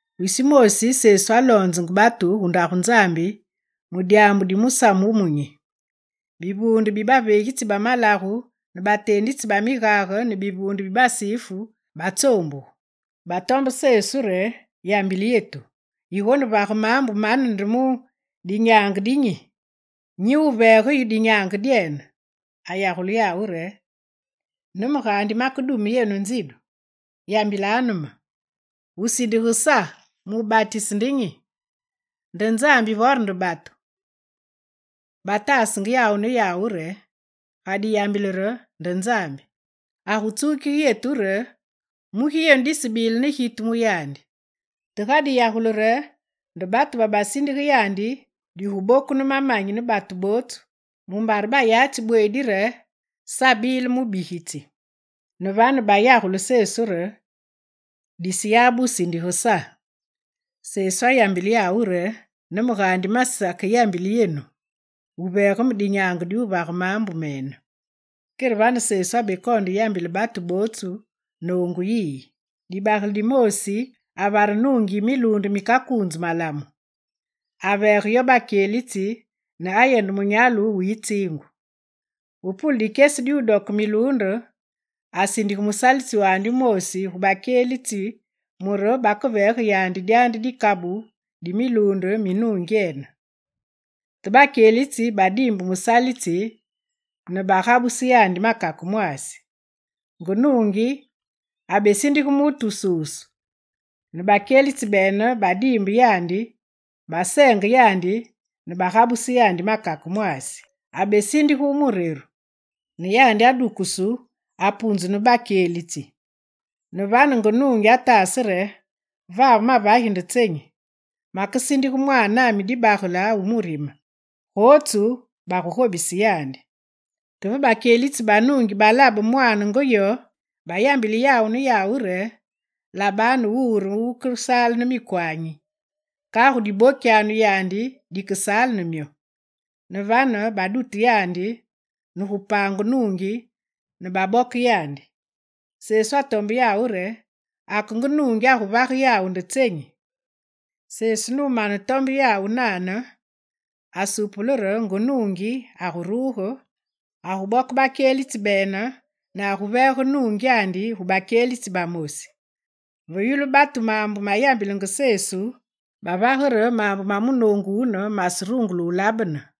Wisi wumoosi, Sesu aloonzenge batu gu Ndagu Nzambi mu dyaambu di musamu wumunyi. Bivuunde bi baveegitsi ba malagu ne bateenditsi ba migage ne bivuunde bi Basifu batsoombugu. Batombe Sesu re: «Yambile yetu, yigonevage maambu mane nde mu dinyaange de nyi, nyi wuveege yu dinyaange dyene?» Ayagule yawu re: «Ne me gaandi makedume yenu nzidu. Yambilanu me: wusindige Sa mu wubatise nde nyi? Nde Nzambi vore nde batu?» Bataasenge yawu ne yawu re: «Ga diyambile re: “Nde Nzambi”, agutsukige yetu re: “Mugi yenu disebile ne gitu mu yandi?” Te ga diyagule re: “Nde batu,” babasindige yandi, diguboku ne mamanyi ne batu bootsu, mumbare bayatsi bweedi re Sa abile mubigitsi.» Ne vane bayagule Sesu re: «Diseyabe wu sindige Sa.» Sesu ayambile yawu re: «Ne me gaandi masakeyambile yenu wuveege me dinyaange di wuvage maambu mene.» Kere vane Sesu abekoonde yambile batu bootsu noongu yiyi: «Dibagele dimoosi avare nuungi yi miluunde mikakuunzu malamu. Aveege yo bakyelitsi ne ayende munyalu wu yitsiingu. Ve pule dikyesi di wudoke miluunde, asindige musalitsi wumoosi gu bakyelitsi mure bakeveege yandi dyandi dikabu di miluunde mi nungyene. Te bakyelitsi badiimbe musalitsi nugabuse yandi makake mwaasi. Nge nuungi abesindige musalitsi wususu; ne bakyelitsi bene babediimbe yandi, baseenge yandi ne bagabuse yandi makake mwaasi. Abesindige wu mureru; ne yandi adukusu, apunzu ne bakyelitsi. Ne vane nge nuungi ataase re: “Vave mavagi nde tsenyi? Makesindige mwaanami dibagele wu murime, gotsu bagugobise yandi.” Te ve bakyelitsi ba nuungi balabe mwaane nge yo, bayambile yawu ne yawu re: “Labanu wuwu re wukesaale ne mikwanyi. Kagu dibokyanu yandi dikesaale ne myo.” Ne vane badute yandi ne gu paange nuungi ne baboke yandi.» Sesu atombe yawu re: «Ake nge nuungi aguvage yawu nde tsenyi?» Sesu numanetombe yawu nane, asupule re nge nuungi aguruge, aguboke bakyelitsi bene nuveege nuungyandi gu bakyelitsi bamosi. Ve yulu batu maambu mayambilenge Sesu, bavage re maambu ma munoongu wune maserungule labene.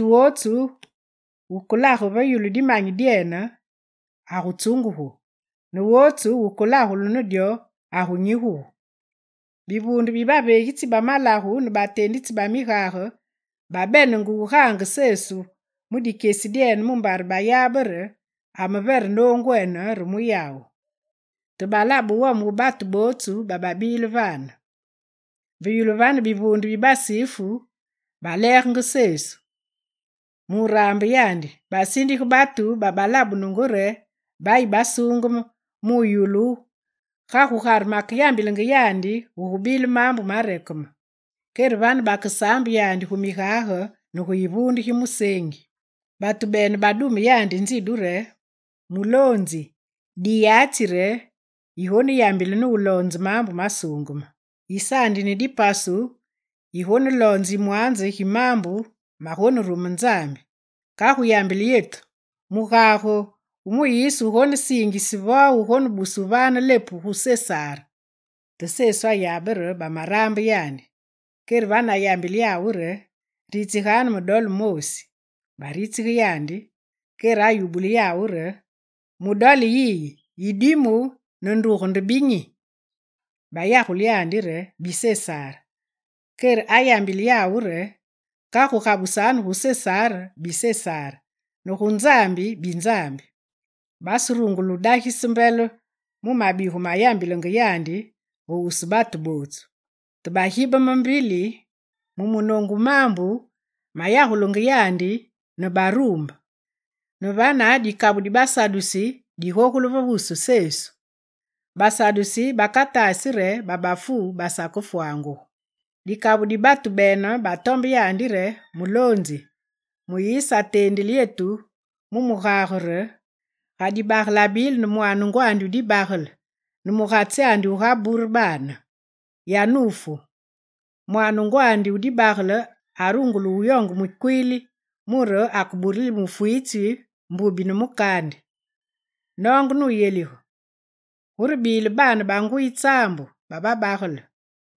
Mutu wotsu wukelage ve yulu dimanyi dyene, agutsungugu, ne wotsu wukelagulu ne dyo agunyigugu.» Bivuunde bibaveegitsi bamalagu ne bateenditsi ba migage babenenge wugaange Sesu mu dikyesi dyene mumbare bayabe re amevere noongwene re mu yawu. Te balabe wome wu batu bootsu bababile vane. Ve yulu vane, bivuunde bi Basifu baleegenge Sesu. Mu wuraambe yandi, basindige batu babalabunungu re bayi basuungeme, mu wuyulu ga gugare makeyambilenge yandi gugubile maambu marekeme. Kere vane bakesaambe yandi gu migage ne gu yivuunde gi museengi. Batu bene badume yandi nzidu re: «Muloonzi, diyatsi re yigoneyambile, nuloonze maambu masuungeme. Yisaandi ne dipasu, yigoneloonze yimwanze gi maambu magonerume Nzambi. Kagu yambile yetu, mugage wu Muyise wugonesiingise, vo wubuse wuvaane lepu gu Sesar?» Te Sesu ayabe re bamaraambe yandi. Kere vane, ayambile yawu re: «Ritsiganu me dole moosi. Baritsige yandi. Kere ayubule yawu re: mu dole yiyi, yidimu ne nduge nde binyi?» Bayagule re: «Bi Sesar.» Kere ayambile yawu re: «Kagu gabusanu gu Sesar bi Sesar ne gu Nzambi bi Nzambi.» Baserungule dagise mbele mu mabigu mayambilenge yandi ve wusu batu. Te bagibeme mbili mu munoongu wu maambu mayagulenge yandi ne baruumbe. Ne vane, dikabu di Basadusi bagogule ve wusu Sesu. Basadusi bakataasi re babafu basakefwangugu. Dikabu di batu bene batombe yandi re: «Muloonzi, Muyise ateendile yetu mu mugage re: “Ga dibagele abile ne mwaane ngwandi wu dibagele ne mugatsi wu gabure baane, yanufu, mwaane ngwandi wu dibagele arungule wuyoonge mukwiili mure bakeburile mufwitsi mbubi ne mukaandi.” Noonge nuyelige, gurebile baane banguyi tsaambu bababagele.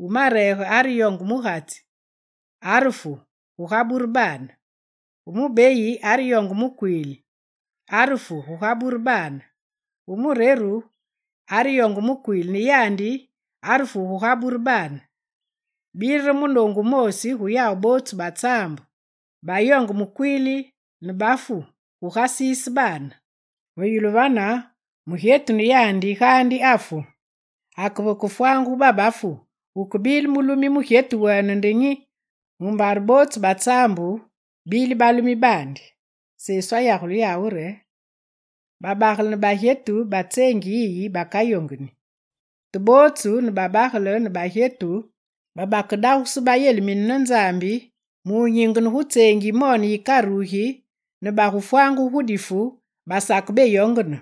Wu mareege areyonge mugatsi, arefu gugabure baane. Wu mubeyi areyonge mukwiili, arefu gugabure baane. Wu mureru areyonge mukwiili, ne yandi, arefu, gugabure baane. Bile re munoongu wumoosi gu yawu bootsu ba tsaambu, bayoonge mukwiili, ne bafu, gugasiise baane. Ve yulu vane, mugyetu ne yandi gaandi afu. Ake vekefwangugu babafu, wukebile mulumi mugyetu wene nde nyi, mumbare bootsu ba tsaambu babile balumi baandi?» Sesu ayagule yawu re: «Babagele ne bagyetu ba tseengi yiyi bakayongeni; Te bootsu ne babagele ne bagyetu babakedagusu bayelimine ne Nzambi, mu wunyingene gu tseengi yimone yikarugi ne bagufwangugu gu difu, basakebeyongene.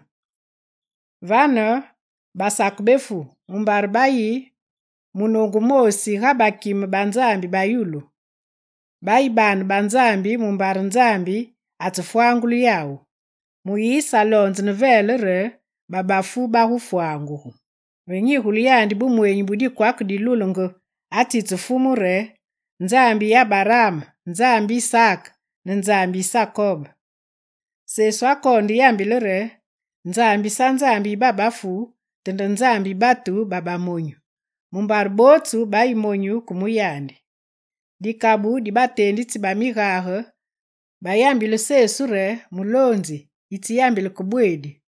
Vane basakebefu, mumbare bayi munoongu wumoosi ga bakime ba Nzambi ba yulu. Bayi baane ba Nzambi mumbare Nzambi atsefwangule yawu. Muyise aloonze ne velee re babafu bagufwangugu. Ve nyigule yandi bumweenyi bu dikwake dilulenge, atsitse Fumu re: “Nzambi yi Abaraam, Nzambi yi Isaak ne Nzambi yi Sakob.”» Sesu akoonde yambile re: «Nzambi sa Nzambi yi babafu, te nde Nzambi yi batu babamonyu, mumbare bootsu bayi monyu ke mu yandi.» Dikabu di bateenditsi ba migage bayambile Sesu re: «Muloonzi, yitseyambile ke bweedi.»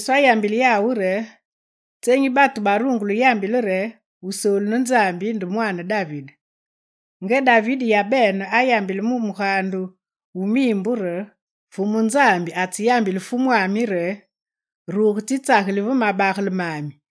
Sesu ayambile yawu re: «Tsenyi batu barungule yambile re Wusoolu ne Nzambi nde mwaane David? Nga David yabene ayambile gu Mugaande wu miimbu re: “Fumu Nzambi atseyambile Fumwami re: Ruge tsitsageli ve mabagele mami,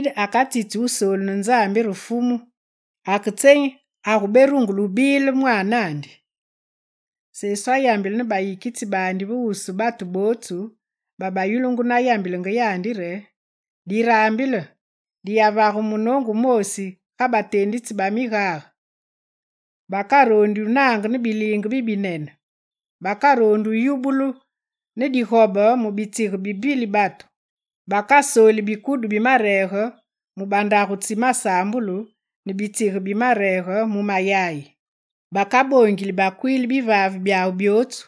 David akatsitsi Wusoolu ne Nzambi re Fumu, ake tsenyi aguberungule bile mwaanandi?» Sesu ayambile ne bayikitsi baandi ve wusu batu bootsu babayulungu nayambilenge yandi re: «Diraambile! Diyavage munoongu wumoosi ga bateenditsi ba migage! Bakaroondi wunange ne biliinge bibinene. Bakaroondi wuyubulu ne digobe mu bitsige bi mbili batu. Bakasoli bikudu bimareege mu bandagu tsi masaambulu ne bitsige bimareege mu mayayi. Bakaboongili bakwiili bivaave byawu byootsu.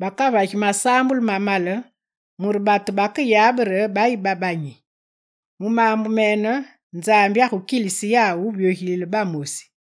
Bakavagi masaambulu mamale mure batu bakeyabe re bayi babanyi. Mu maambu mene, Nzambi agukilise yawu wuvyogilile bamosi.»